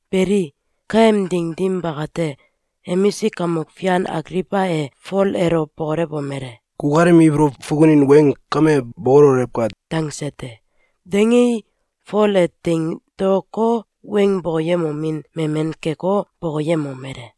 Beli, kaem ding dim bakate, emisik kamok fian Agliwba e Fol elo bokolewomele: “Kukalem ibolow fukunin weng kame bokololewka!”, dangse te. Dangei, Fol e teing daoko, weng bokoyemomin memen keko, bokoyemomele: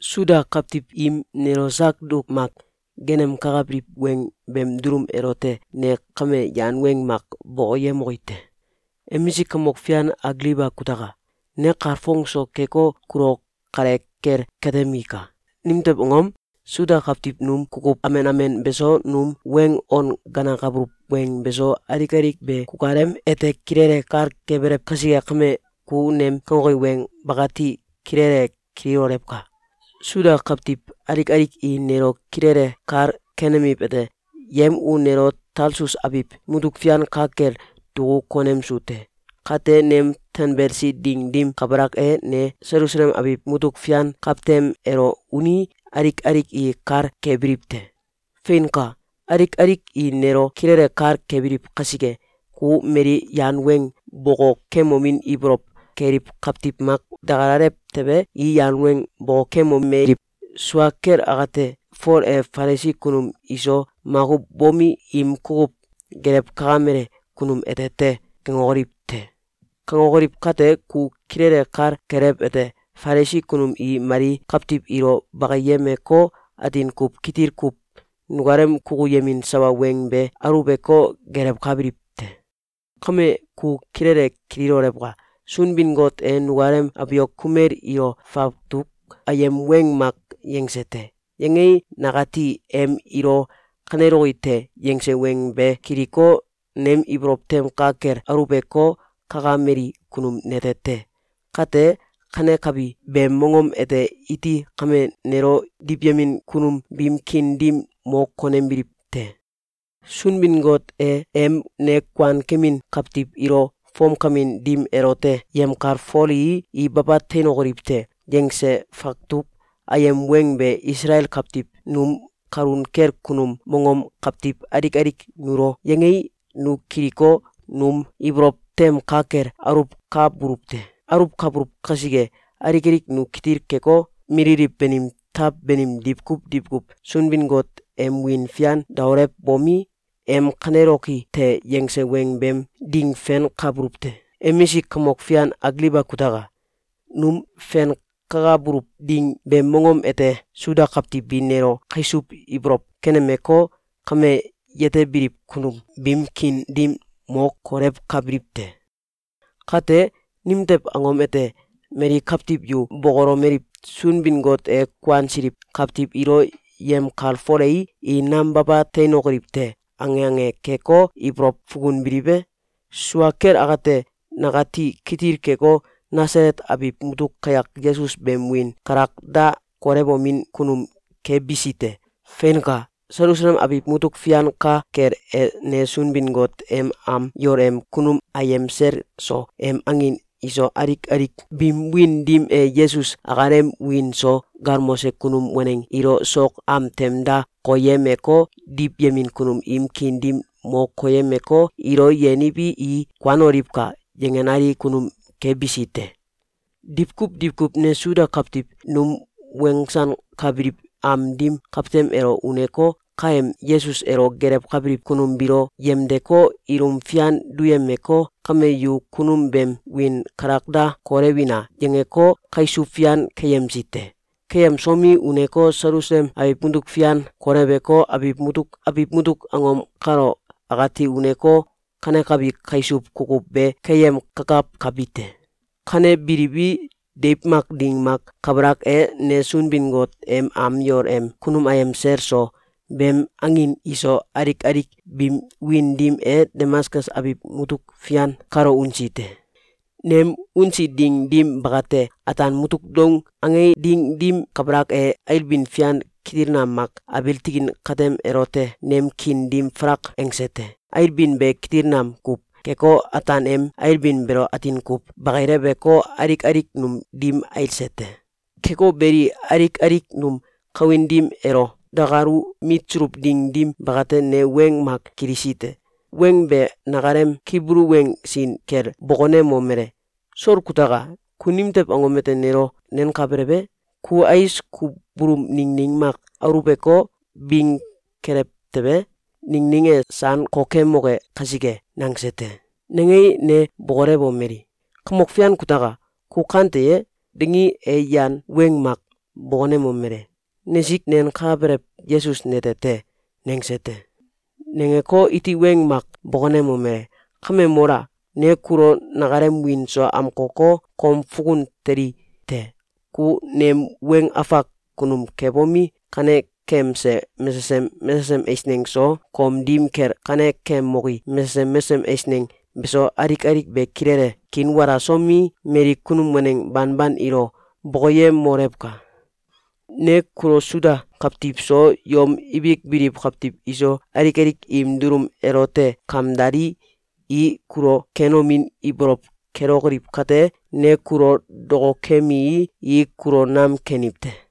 “Suda kawtiw im nelo sak duk mak geenemkakabiliw weng beem dulum elote ne kame yan weng mak bokoyemoki te. Emisik kamok fian Agliwba kutaka! Ne kalfong so keko, kulo kale kel katemika. Nimtew angom? Suda kawtiw num kukuw amen amen beso, num weng on ganakabuluw weng beso, alik alik be kukalem ete kilele kal kebelew kasike kame, ku nem kangoki weng bakati kilele kililolewka! Suda kawtiw alik alik i nelo kilele kal kenemiwete: Yem u nelo Talsus abiw mutuk fian ka kel duku konemsu te. Kate, nem tanbelsi ding dim kabalak e, ne Selusalem abiw mutuk fian kawtem elo unii, alik alik i kal kebiliw te. Feinka! Alik alik i nelo kilele kal kebiliw kasike, ku mali yan weng bokokemomin ibolow keliw kawtiw mak dakalalew tewe, i yan weng bokokemomeliw: ‘Sua kel akate, Fol e Falisi kunum iso makuw bomi, im kukuw gelewkakamele kunum ete te.’, kangokoliw te. Kangokoliw kate, ku kilele kal kelewete: Falisi kunum i mali kawtiw ilo bakiyemeko, atin kuw kitil kuw nukalem kukuyemin sawa weng be aluweko, gelewkabiliw te. Kame, ku kilele kililolewka! Sunbin-Got e nukalem abiok kumel ilo fawtuk ayem weng mak yangse te. Yangei, nakati em ilo ‘Kaneloki te!’, yangse weng be kiliko, nem ibolow tem ka kel aluweko, kakameli kunum nete te. Kate, kanekabi beem mongom ete i kame nelo diwyemin kunum biim kiin dim mo konembiliw te. Sunbin-Got e em ‘Ne kuankemin kawtiw ilo fomkamin dim elote yemkalfolii, i baba teinokoliw te!’, yangse fawtuk ayem weng be Isalael kawtiw num kalun kel kunum mongom kawtiw alik alik nulo yangei, nu kiliko, num ibolow tem ka kel aluwkabuluw te. Aluwkabuluw kasike, alik alik nu kitil keko, mililiw banim taw banim diwkuw diwkuw Sunbin-Got em wiin fian daolewbomi, em ‘Kaneloki te!’, yange weng beem ding fenkabuluw te. Emisik kamok fian Agliwba kutaka! Num fenkakabuluw ding beem mongom ete Suda kawtiw bi nelo kaisuw ibolow kenemeko, kame, yetebiliw kunum biim kiin dim mo kolewkabiliw te. Kate, nimtew angom ete, mali kawtiw yu bokolomeliw: ‘Sunbin-Got e kuansiliw kawtiw ilo yemkalfolei, i nam baba teinokoliw te!’, ange ange keko, ibolow fukunbiliw e? Sua kel akate, nakati kitil keko, Nasalet abiw mutuk kayak Yesus beem wiin kalak da kolewomin kunum kebisi te. Feinka! Selusalem abiw mutuk fian ka kel e, ne Sunbin-Got em am yol em kunum ayem sel so, em angin iso, alik alik biim wiin dim e Yesus akalem wiin so galmose kunum waneng ilo sok am tem da koyemeko, diwyemin kunum im kiin dim mo keyemeko, ‘Ilo yeniwi, i kuanoliwka!’, yangenali kunum kebisi te. Diwkuw diwkuw ne Suda kawtiw num wensankabiliw am dim kawtem elo uneko, kaem Yesus elo gelewkabiliw kunum biilo yemdeko, ilum fian duyemeko, ‘Kame, yu kunum beem wiin kalak da kolewina!’, yangeko, kaisuw fian keyemsi te. Keyemsomi, uneko, Selsualem abiw mutuk fian koleweko, abiw mutuk abiw mutuk angom kalo akati uneko, kanekabi kaisuw kukuw be keyemkakawkabi te. Kanebilii, deiw mak ding mak kabalak e, ne Sunbin-Got em am yol em kunum ayem sel so, beem angin iso, alik alik biim wiin dim e Damaskus abiw mutuk fian kalo unsi te. Nem unsi ding dim bakate, ataan mutuk doung ange ding dim kabalak e, ailbin fian kitil nam mak abiil tikin katem elote nem kiin dim falak angse te. Ailbin be kitil nam kuw keko, ataan em ailbin beelo atin kuw bakileweko, alik alik num dim ailse te. Keko beli, alik alik num kawin dim elo dakalu mitsuluw ding dim bakate, ne weng mak kilisi te. Weng be nakalem Kibulu weng sin kel bokonemomele: ‘Sol kutaka! Ku nimtew angom ete nelo nenkabelew e? Ku ais kubulum ningning mak aluweko, bing kelew tewe, ningning e san kokemoke kasike.’, nangse te. Nangei, ne bokolewomeli: ‘Kamok Fian kutaka! Ku kante ye?’, dangii, e yan weng mak bokonemomele: ‘Nesik nenkabelew Yesus nete te!’, nangse te. Nangeko, iti weng mak bokonemomele: ‘Kame mola! Ne kulo nakalem wiin so amkoko, kom fukun teli te. Ku nem weng afak kunum kebomi, kanekemse mesesem mesesem eisneng so, kom dim kel kanekemoki mesesem mesesem eisneng beso, alik alik be kilele kiinwalasomi, mali kunum waneng banban ilo bokoyemolewka! Ne kulo Suda kawtiw so, yom ibik biliw kawtiw iso, alik alik im dulum elote kamdalii, i kulo kenomin ibolow kelokoliw kate, ne kulo dokokemii, i kulo nam keniw te.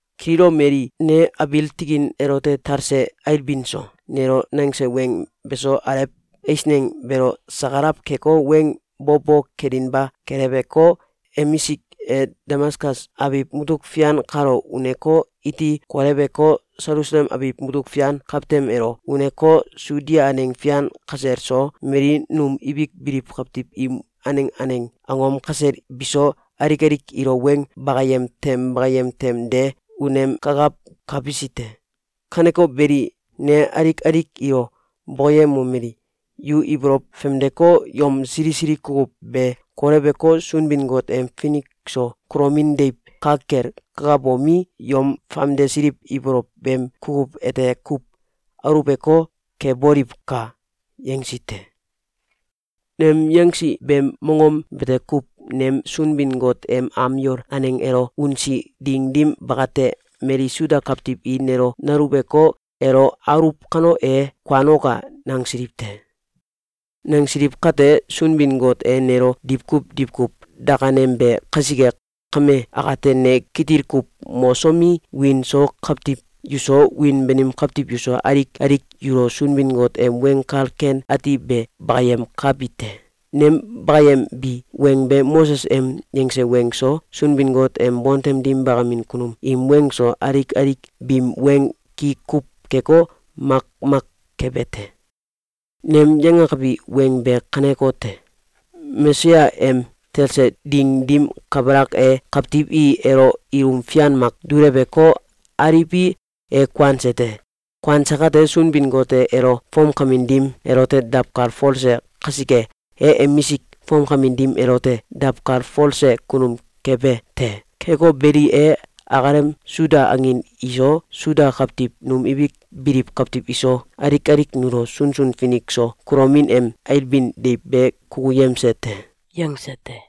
Kililomelii, ne abiil tikin elote talse ailbin so, nelo nangse weng beso, alew eisneng beelo sakalaw keko, weng bo bo kelinba keleweko, emisik e, Damaskus abiw mutuk fian kalo uneko, iti koleweko, Selusalem abiw mutuk fian kawtem elo uneko, Sudia aneng fian kasel so, mali num ibik biliw kawtiw im aneng aneng angom kasel biso, alik alik ilo weng bakayem tem bakayem tem de unemkakawkabisi te. Kaneko beli, ne alik alik ilo bokoyemomeli: ‘Yu ibolow famdeko, yom sili sili kukuw be koleweko, Sunbin-Got em finik so kulomin deiw ka kel kakabomi, yom famdesiliw ibolow beem kukuw ete kuw aluweko, keboliwka!’, yangsi te. Nem yangsi beem mongom bete kuw nem Sunbin-Got em am yol aneng elo unsi ding dim bakate, mali Suda kawtiw i nelo naluweko, ‘Elo aluwuw kano, e kuanoka!’, nangsiliw te. Nangsiliw kate, Sunbin-Got e nelo diwkuw diwkuw dakanembe kasike, kame akate, ne kitil kuw mosomi, wiin so kawtiw yuso, wiin banim kawtiw yuso, alik alik yulo Sunbin-Got em Weng Kal Ken Ati be bakayemkabi te. Nem bakayembi weng be Moses em yangse weng so, Sunbin-Got em bontem dim bakamin kunum im weng so, alik alik biim weng ki kuw keko, makmak kebe te. Nem yangakabi weng be kanekote: Mesaya em talse ding dim kabalak e, kawtiw i elo ilum fian mak duleweko, aliwi, e kuanse te. Kuanse kate, Sunbin-Got e elo fomkamin dim elote dawkalfolse kasike, e emisik fomkamin dim elote dawkalfolse kunum kebe te. Keko beli, e akalem Suda angin iso, Suda kawtiw num ibik biliw kawtiw iso, alik alik nulo sunsun finik so kulomin em ailbin deiw be kukuyemse te.”, yangse te.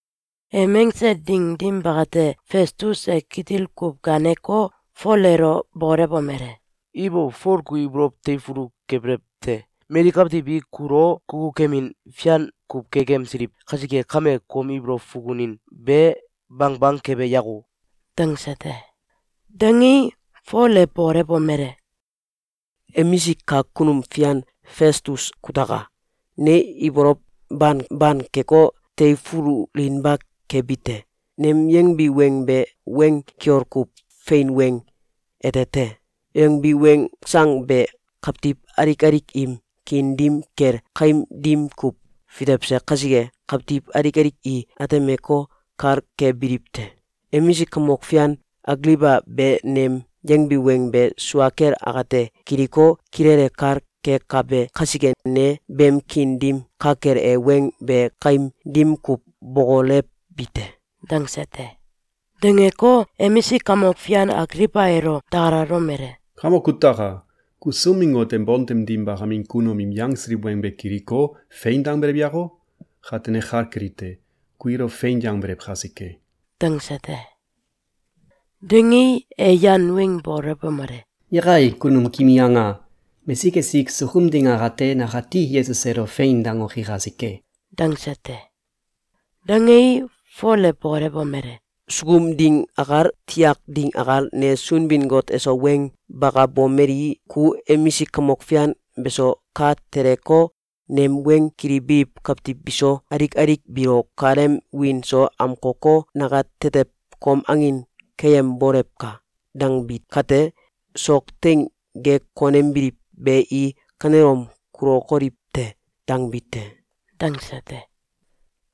Em angse ding dim bakate, Festus e kitil kuw gaaneko, Fol elo bokolewomele: “Ibo! Fol ku ibolow teifulu kebelew te! Mali kawtiw i kulo kukukemin fian kuw kekemsiliw kasike kame, kom ibolow fukunin be bangbang kebe yako!”, dangse te. Dangei, Fol e bokolewomele: “Emisik kak kunum fian Festus kutaka! Ne ibolow bangban keko, teifululinba kebi te. Nem yangbi weng be weng kiol kuw fein weng ete te. Yangbi weng sang be kawtiw alik alik im kiin dim kel kaim dim kuw fitewse kasike, kawtiw alik alik i atemeko, kal kebiliw te. Emisik kamok fian Agliwba be nem yangbi weng be sua kel akate kiliko, kilele kal kekabe kasike, ne beem kiin dim ka kel e weng be kaim dim kuw bokolewbi te.”, dangse te. Dangeko, emisik kamok fian Agliwba elo dakalalomele: “Kamoka kutaka! Ku Sunbin-Got em bontem dim bakamin kunum im yangsiliw weng be kiliko, ‘Fein!’, dangbelew yako? Kate ne kal kelite: Ku ilo fein yangbelew kasike.”, dangse te. Dangei, e yan weng bokolewomele: “Yakai! Kame kimi anga! Mesik esik sukum ding akate, nakati Yesus elo ‘Fein!’, dangoki kasike!”, dangse te. Dangei, Fol e bokolewomele: “Sukum ding akal, tiakim ding akal, ne Sunbin-Got eso weng bakabomeli: ‘Ku emisik kamok fian beso, ka teleko, nem weng kilibiliw kawtiw biso, alik alik biilo kukalem wiin so amkoko, nakatetew kom angin keyembolewka!’, dangbi kate, ‘Sok teing ge konembiliw be i kanelom kulokoliw te!’, dangbi te.”, dangse te.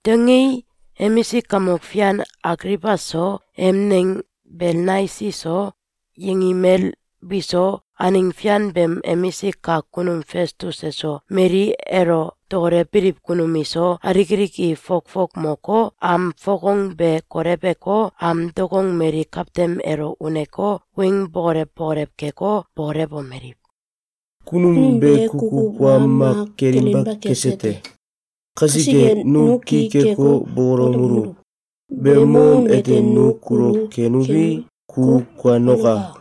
Dangei, emisik kamok fian Agliwba so, em neng Belnaisi so, yengimel biso, aneng fian beem emisik kak kunum Festus eso, mali elo dokolewbiliw kunum iso, alik alik i fokfok moko, am fokong be koleweko, am dokong mali kawtem elo uneko, weng bokolew bokolew keko, bokolomeliw: “Kunum be kukuw wa mak kelinba kese te. Kasike, nu ki keko, bokolewomeluw: ‘Beem mongom ete nu kulo kenuwi, ku kuanoka!’,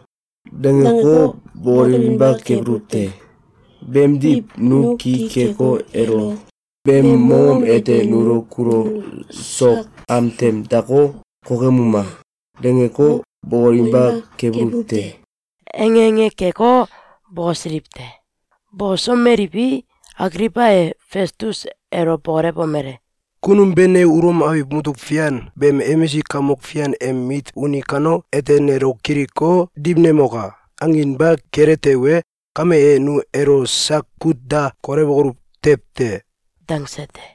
dangeko, bokolewinba kebuluw te. Beemdiw, nu ki keko, elo ‘Beem mongom ete nu kulo sok am tem dako, kokemuma!’, dangeko, bokolewinba kebuluw te.”, ange ange keko, bokosiliw te. Bokosomeliwi, Agliwba e Festus elo bokolewomele: “Kunum be ‘Ne Ulom abiw mutuk fian beem emisik kamok fian em mit uni kano, ete nelo kiliko, diwnemoka!’, anginba kele tewe, kame e, nu elo sak kut da kolewokoluw tew te!”, dangse te.